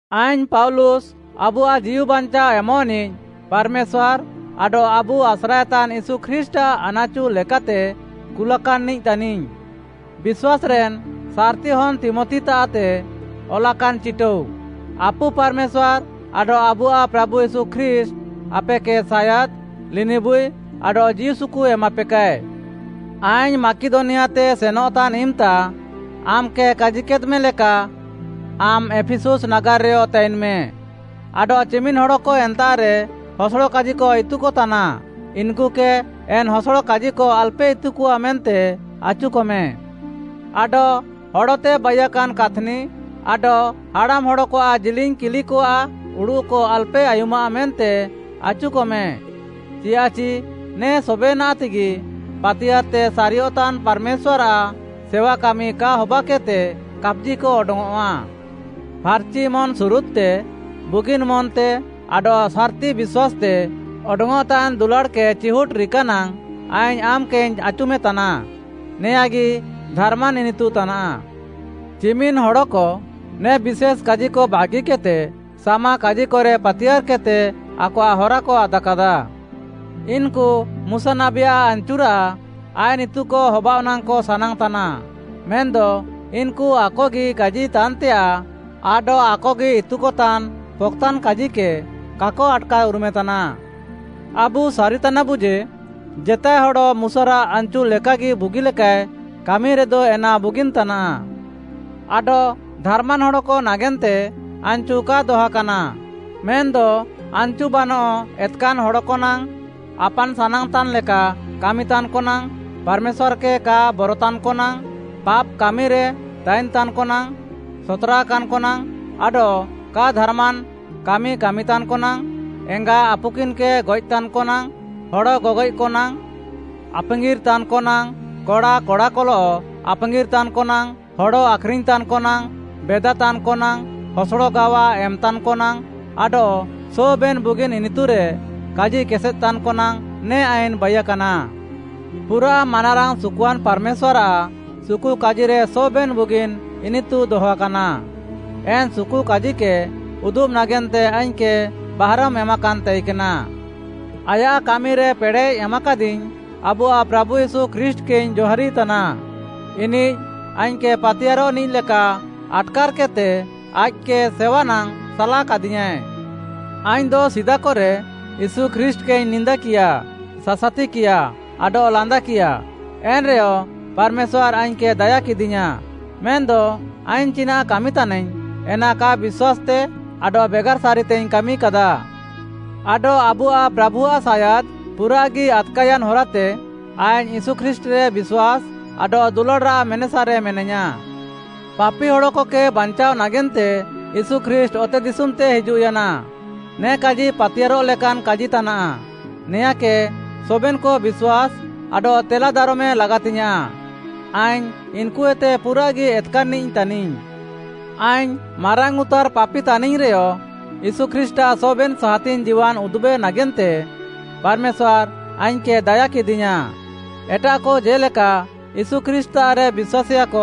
ଆଇଙ୍ଗ୍‌ ପାଉଲୁସ୍‌, ଆବୁଆଃ ଜୀଉବାଞ୍ଚାଅ ଏମଃନିଃ ପାର୍‌ମେଶ୍ୱାର୍‌ ଆଡଃ ଆବୁ ଆସ୍ରାଏତାନ୍‌ ୟୀଶୁ ଖ୍ରୀଷ୍ଟ୍‌ଆଃ ଆନାଚୁ ଲେକାତେ କୁଲାକାନ୍‌ନିଃ ତାନିଙ୍ଗ୍‌, ବିଶ୍ୱାସ୍‌ରେନ୍ ସାର୍‌ତି ହନ୍‌ ତୀମଥିତାଃତେ ଅଲାକାନ୍‌ ଚିଟାଉ: ଆପୁ ପାର୍‌ମେଶ୍ୱାର୍‌ ଆଡଃ ଆବୁଆଃ ପ୍ରାଭୁ ୟୀଶୁ ଖ୍ରୀଷ୍ଟ୍‌ ଆପେକେ ସାୟାଦ୍, ଲିନିବୁଇ ଆଡଃ ଜୀଉସୁକୁ ଏମାପେକାଏ। ଆଇଙ୍ଗ୍‌ ମାକିଦନିଆତେ ସେନଃତାନ୍‌ ଇମ୍‌ତା ଆମ୍‌କେ କାଜିକେଦ୍‌ମେ ଲେକା ଆମ୍‌ ଏଫିସୁସ୍‌ ନାଗାର୍‌ରେୟ ତାଇନ୍‌ମେ ଆଡଃ ଚିମିନ୍‌ ହଡ଼କ ଏନ୍ତାଃରେ ହସଡ଼କାଜିକ ଇତୁକତାନା, ଇନ୍‌କୁକେ ଏନ୍‌ ହସଡ଼କାଜିକ ଆଲ୍‌ପେ ଇତୁକଆ ମେନ୍ତେ ଆଚୁକମେ। ଆଡଃ ହଡ଼ତେ ବାଇୟାକାନ୍‌ କାଥ୍‌ନି ଆଡଃ ହାଡ଼ାମ୍‌ହଡ଼କଆଃ ଜିଲିଙ୍ଗ୍‌ କିଲିକଆଃ ଉଡ଼ୁଃକ ଆଲ୍‌ପେ ଆୟୁମାଃ ମେନ୍ତେ ଆଚୁକମେ, ଚିୟାଃଚି ନେ ସବେନାଃତେଗି ପାତିୟାର୍‌ତେ ସାରିୟଃତାନ୍‌ ପାର୍‌ମେଶ୍ୱାର୍‌ଆଃ ସେୱା କାମି କା ହବାକେଦ୍‌ତେ କାପ୍‌ଜିକ ଅଡଙ୍ଗ୍‌ଅଃଆ। ଫାର୍‌ଚି ମନ୍‌ସୁରୁଦ୍‌ତେ, ବୁଗିନ୍‌ ମନ୍‌ତେ ଆଡଃ ସାର୍‌ତି ବିଶ୍ୱାସ୍‌ତେ ଅଡଙ୍ଗ୍‌ଅଃତାନ୍‌ ଦୁଲାଡ଼୍‌କେ ଚିହୁଟ୍‌ ରିକାନାଙ୍ଗ୍‌ ଆଇଙ୍ଗ୍‌ ଆମ୍‌କେଇଙ୍ଗ୍‌ ଆଚୁମେତାନା। ନେଆଁଁଗି ଧାର୍‌ମାନ୍‌ ଇନିତୁ ତାନାଃ। ଚିମିନ୍‌ ହଡ଼କ ନେ ବିଶେଷ୍‌ କାଜିକ ବାଗିକେଦ୍‌ତେ ସାମାକାଜିକରେ ପାତିୟାର୍‌କେଦ୍‌ତେ ଆକଆଃ ହରାକ ଆଦାକାଦା। ଇନ୍‌କୁ ମୁଶା ନାବୀଆଃ ଆନ୍‍ଚୁରାଃ ଆଇନ୍‌ ଇତୁକ ହବାଅଃ ନାଙ୍ଗ୍‌କ ସାନାଙ୍ଗ୍‌ତାନା, ମେନ୍‌ଦ ଇନ୍‌କୁ ଆକଗି କାଜିତାନ୍‌ତେୟାଃ ଆଡଃ ଆକଗି ଇତୁକତାନ୍‌ ପକ୍‌ତାନ୍ କାଜିକେ କାକ ଆଟ୍‌କାର୍‌ଉରୁମେତାନା। ଆବୁ ସାରିତାନାବୁ ଯେ, ଜେତାଏ ହଡ଼ ମୁଶାରାଃ ଆନ୍‌ଚୁ ଲେକାଗି ବୁଗିଲେକାଏ କାମିରେଦ ଏନା ବୁଗିନ୍‌ ତାନାଃ। ଆଡଃ ଧାର୍‍ମାନ୍ ହଡ଼କ ନାଗେନ୍ତେ ଆନ୍‌ଚୁ କା ଦହାକାନା, ମେନ୍‌ଦ ଆନ୍‌ଚୁ ବାନଃ ଏତ୍‌କାନ୍‌ ହଡ଼କ ନାଙ୍ଗ୍‌, ଆପାନ୍‌ ସାନାଙ୍ଗ୍‌ତାନ୍‌ଲେକା କାମିତାନ୍‌କ ନାଙ୍ଗ୍‌, ପାର୍‌ମେଶ୍ୱାର୍‌କେ କା ବରତାନ୍‌କ ନାଙ୍ଗ୍‌, ପାପ୍‌କାମିରେ ତାଇନ୍‌ତାନ୍‌କ ନାଙ୍ଗ୍‌, ସତ୍‌ରାକାନ୍‌କ ନାଙ୍ଗ୍‌, ଆଡଃ କା ଧାର୍‌ମାନ୍‌ କାମି କାମିତାନ୍‌କ ନାଙ୍ଗ୍‌, ଏଙ୍ଗା, ଆପୁକିନ୍‌କେ ଗଏଃତାନ୍‌କ ନାଙ୍ଗ୍‌, ହଡ଼ ଗଗଏଃକ ନାଙ୍ଗ୍‌, ଆପାଙ୍ଗିର୍‌ତାନ୍‌କ ନାଙ୍ଗ୍‌, କଡ଼ା କଡ଼ାକଲଃ ଆପାଙ୍ଗିର୍‌ତାନ୍‌କ ନାଙ୍ଗ୍‌, ହଡ଼ ଆଖ୍‌ରିଙ୍ଗ୍‌ତାନ୍‌କ ନାଙ୍ଗ୍‌, ବେଦାତାନ୍‌କ ନାଙ୍ଗ୍‌, ହସଡ଼ ଗାୱା ଏମ୍‌ତାନ୍‌କ ନାଙ୍ଗ୍‌ ଆଡଃ ସବେନ୍‌ ବୁଗିନ୍‌ ଇନିତୁରେ କାଜିକେସେଦ୍‌ତାନ୍‍କ ନାଙ୍ଗ୍‌ ନେ ଆଇନ୍‌ ବାଇୟାକାନା। ପୁରାଃ ମାନାରାଙ୍ଗ୍‌ ସୁକୁଆନ୍‌ ପାର୍‌ମେଶ୍ୱାର୍‌ଆଃ ସୁକୁକାଜିରେ ସବେନ୍‌ ବୁଗିନ୍‌ ଇନିତୁ ଦହାକାନା। ଏନ୍‌ ସୁକୁକାଜିକେ ଉଦୁବ୍‌ ନାଗେନ୍ତେ ଆଇଙ୍ଗ୍‌କେ ବାହାରମ୍‌ ଏମାକାନ୍‌ ତାଇକେନା। ଆୟାଃ କାମିରେ ପେଡ଼େଃ ଏମାକାଦିଙ୍ଗ୍‌ ଆବୁଆଃ ପ୍ରାଭୁ ୟୀଶୁ ଖ୍ରୀଷ୍ଟ୍‌କେଇଙ୍ଗ୍‌ ଜହାରିତାନା। ଇନିଃ ଆଇଙ୍ଗ୍‌କେ ପାତିୟାର୍‌ରଃନିଃ ଲେକା ଆଟ୍‌କାର୍‌କେଦ୍‌ତେ ଆଇଃକ୍‌କେ ସେୱା ନାଙ୍ଗ୍‌ ସାଲାକାଦିୟାଁଏ। ଆଇଙ୍ଗ୍‌ଦ ସିଦାକରେ ୟୀଶୁ ଖ୍ରୀଷ୍ଟ୍‌କେଇଙ୍ଗ୍‌ ନିନ୍ଦାକିୟା, ସାସାତିକିୟା, ଆଡଃ ଲାନ୍ଦାକିୟା, ଏନ୍‌ରେହ ପାର୍‌ମେଶ୍ୱାର୍‌ ଆଇଙ୍ଗ୍‌କେ ଦାୟାକେଦିୟାଁ, ମେନ୍‌ଦ ଆଇଙ୍ଗ୍‌ ଚିନାଃ କାମି ତାଇନାଇଙ୍ଗ୍‌ ଏନା କା ବିଶ୍ୱାସ୍‌ତେ ଆଡଃ ବେଗାର୍‌ ସାରିତେଇଙ୍ଗ୍‌ କାମିକାଦା। ଆଡଃ ଆବୁଆଃ ପ୍ରାଭୁଆଃ ସାୟାଦ୍‌ ପୁରାଃଗି ଆଦ୍‌କାୟାନ୍‌ ହରାତେ ଆଇଙ୍ଗ୍‌ ୟୀଶୁ ଖ୍ରୀଷ୍ଟ୍‌ରେ ବିଶ୍ୱାସ୍‌ ଆଡଃ ଦୁଲାଡ଼୍‌ରାଃ ମେନେସାରେ ମେନାଇୟାଁ। ପାପି ହଡ଼କକେ ବାଞ୍ଚାଅ ନାଗେନ୍ତେ ୟୀଶୁ ଖ୍ରୀଷ୍ଟ୍‌ ଅତେଦିଶୁମ୍‌ତେ ହିଜୁଃୟାନା, ନେ କାଜି ପାତିୟାର୍‌ରଃ ଲେକାନ୍‌ କାଜି ତାନାଃ, ନେଆଁଁକେ ସବେନ୍‌କ ବିଶ୍ୱାସ୍‌ ଆଡଃ ତେଲାଦାରମେ ଲାଗାତିଙ୍ଗ୍‌ୟାଁଃ। ଆଇଙ୍ଗ୍‌ ଇନ୍‌କୁଏତେ ପୁରାଃଗି ଏତ୍‌କାନ୍‌ନିଃ ତାନିଙ୍ଗ୍‌। ଆଇଙ୍ଗ୍‌ ମାରାଙ୍ଗ୍‌ଉତାର୍‍ ପାପି ତାନିଙ୍ଗ୍‌ରେୟ ୟୀଶୁ ଖ୍ରୀଷ୍ଟ୍‌ଆଃ ସବେନ୍‌ ସାହାତିଙ୍ଗ୍‌ ଜୀୱାନ୍‌ ଉଦୁବ୍‌ ନାଗେନ୍ତେ ପାର୍‌ମେଶ୍ୱାର୍‌ ଆଇଙ୍ଗ୍‌କେ ଦାୟାକେଦିୟାଁ। ଏଟାଃକ ଜେ'ଲେକା ୟୀଶୁ ଖ୍ରୀଷ୍ଟ୍‌ତାଃରେ ବିଶ୍ୱାସେୟାକ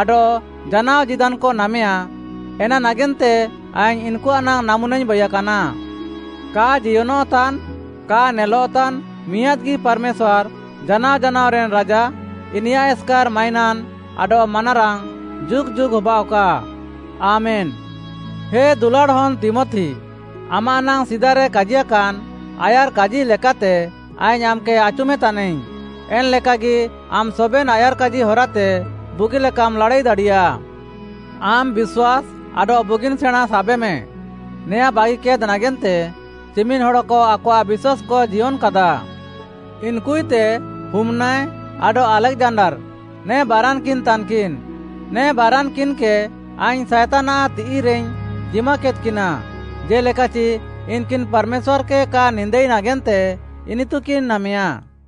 ଆଡଃ ଜାନାଅ ଜୀଦାନ୍‌କ ନାମେୟା। ଏନା ନାଗେନ୍ତେ ଆଇଙ୍ଗ୍‌ ଇନ୍‌କୁଆଃ ନାଙ୍ଗ୍‌ ନାମୁନାଇଙ୍ଗ୍‌ ବାଇୟାକାନା। କା ଜିୟନଃତାନ୍‌, କା ନେଲଃତାନ୍‌, ମିଆଁଦ୍‌ଗି ପାର୍‌ମେଶ୍ୱାର୍‌ ଜାନାଅ ଜାନାଅରେନ୍‌ ରାଜା, ଇନିୟାଃ ଏସ୍‌କାର୍‌ ମାଇନାନ୍‌ ଆଡଃ ମାନାରାଙ୍ଗ୍‌ ଯୁଗ୍‌ ଯୁଗ୍‌ ହବାଃଅକା! ଆମେନ୍‌। ହେ ଦୁଲାଡ଼୍‌ ହନ୍‌ ତୀମଥି, ଆମାଃ ନାଙ୍ଗ୍‌ ସିଦାରେ କାଜିୟାକାନ୍ ଆୟାର୍‌କାଜି ଲେକାତେ ଆଇଙ୍ଗ୍‌ ଆମ୍‌କେ ଆଚୁମେତାନାଇଙ୍ଗ୍‌, ଏନ୍‌ ଲେକାଗି ଆମ୍‌ ସବେନ୍‌ ଆୟାର୍‌କାଜି ହରାତେ ବୁଗିଲେକାମ୍‌ ଲାଡ଼ାଇ ଦାଡ଼ିୟା। ଆମ୍‌ ବିଶ୍ୱାସ୍‌ ଆଡଃ ବୁଗିନ୍‌ ସେଣାଁଁ ସାବେମେ, ନେଆଁଁ ବାଗିକେଦ୍‌ ନାଗେନ୍ତେ ଚିମିନ୍‌ ହଡ଼କ ଆକଆଃ ବିଶ୍ୱାସ୍‌କ ଜିୟନ୍‌କାଦା। ଇନ୍‌କୁଏତେ ହୁମ୍‌ନାୟ ଆଡଃ ଆଲେକ୍‌ଜାଣ୍ଡାର୍‌, ନେ ବାରାନ୍‌କିନ୍‌ ତାନ୍‌କିନ୍‌। ନେ ବାରାନ୍‌କିନ୍‌କେ ଆଇଙ୍ଗ୍‌ ସାଏତାନ୍‌ଆଃ ତିଃଇରେଇଙ୍ଗ୍‌ ଜିମାକେଦ୍‌କିନା, ଜେ'ଲେକାଚି ଇନ୍‌କିନ୍‌ ପାର୍‌ମେଶ୍ୱାର୍‌କେ କା ନିନ୍ଦାଇ ନାଗେନ୍ତେ ଇନିତୁକିନ୍‌ ନାମେୟା।